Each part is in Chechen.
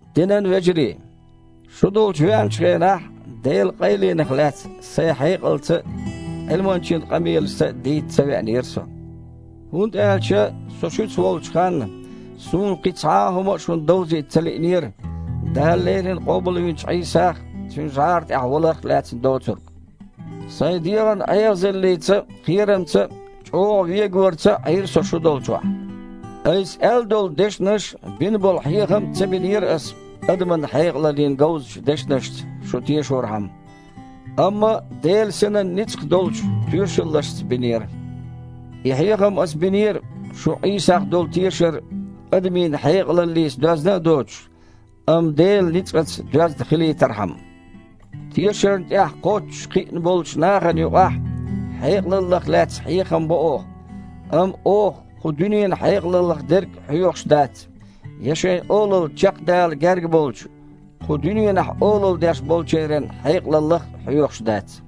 Динан вежарий! Шу долчу веанчу хенахь, Делан къайленах лаьцна сайн хьекъалца а, Іилманчин къамелашца а дийца ца веанера со, хІунда аьлча со шуьца волчу ханна суна кхин цхьа хІума а шуна довзийта ца лиънера, Дала леррина къобалвинчу Іийсах а, Цуьнан жІара тІехь валарх а лаьцнарг доцург. Сайн дегІан эгІазаллица а, кхерамца а, чІогІа вегаварца а Іийра со шу долчохь. Айса аьлла долу дешнаш а, бина болу хьехам а ца бинера аса адаман хьекъалаллин говзачу дешнашца шу тешорхьама, амма Делан Синан ницкъах долчу тоьшаллашца бинера. И хьехам ас бинера, шун Іийсах долу тешар адамийн хьекъалаллица доьзна а доцуш, амма Делан ницкъаца доьзна хилийтархьама. Тешарна тІехь кхоччуш кхиъна болчу нахана юкъахь хьекъалаллах лаьцна хьехам бо оха. Амма оха кху дуьненан хьекъалаллах дерг а хьоьхуш дац, я шайн олалла чекхдала герга болчу, кху дуьненахь олалла деш болчеран хьекъалаллах а хьоьхуш дац.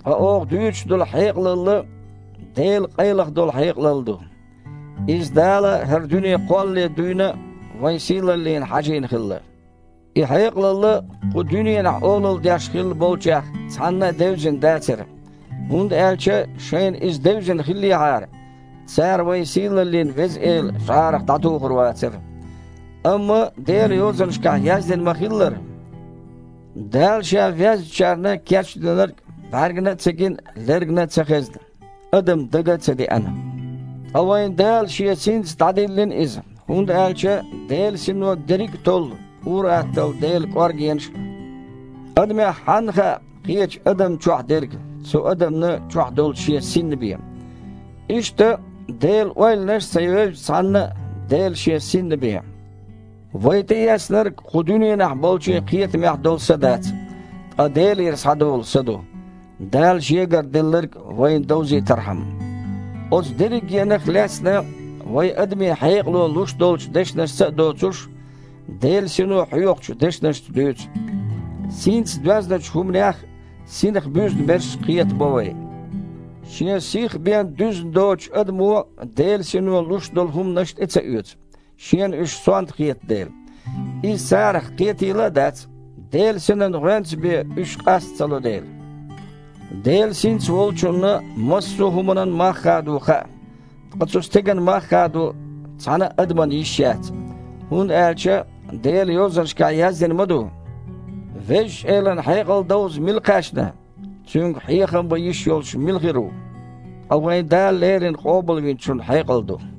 Ткъа оха дуьйцуш долу хьекъалалла – Делан къайлаха долу хьекъалалла ду. Иза Дала хІара дуьне кхоллале дуьйна а вайн сийлаллина хьажийна хилла. И хьекъалалла кху дуьненахь олалла деш хилла болчех цхьанна а девзина дацара, хІунда аьлча шайна иза девзина хиллехьара, цара вайн сийлаллин Веза Эла жІарах дІатухур вацара. Амма Делан Йозанашкахь яздина ма-хиллара: «Дала Ша везначарна кечдинарг бІаьргана а ца гина, лергана а ца хезна, адамна дага а ца деана». Ткъа вайна Дала Шен Синца дІадиллина иза, хІунда аьлча Делан Сино дерриг а толлу, ур-атталла Делан кІоргенаш а. Адамех хьанна хаьа, кхечу адамна чохь дерг, цу адамна чохь долчу шен синна бен? Иштта Делан ойланаш а ца евза цхьанна а, Делан Шен Синна бен. Вай тІеэцнарг кху дуьненахь болчийн кхетамехь долу са дац, ткъа Делера схьадолу Са ду, Дала Шегара делларг вайна довзийтархьама. Оцу дерригенах а лаьцна, вайн адамийн хьекъало луш долчу дешнашца а доцуш, Делан Сино хьоьхучу дешнашца дуьйцу. Синца доьзначу хІуманех Синах буьзна берш кхетабо вай. Шен сих бен дуьзна доцучу адамо Делан Сино луш долу хІуманаш тІе ца оьцу, шена уьш сонта хета дела. Иза царах кхетийла а дац, Делан Синан гІоьнца бен уьш къаста ца ло дела. Делан Синца волчунна массо а хІуманан мах хадо хаьа. Ткъа цу стеган мах хадо цхьана а адаман йиш яц. ХІунда аьлча Делан Йозанашкахь яздина ма ду: «Везачу Элан хьекъал довза мила кхаьчна? Цуьнга хьехам бан йиш йолуш мила хир ву?» Ткъа вайн Дала леррина Къобалвинчун хьекъал ду.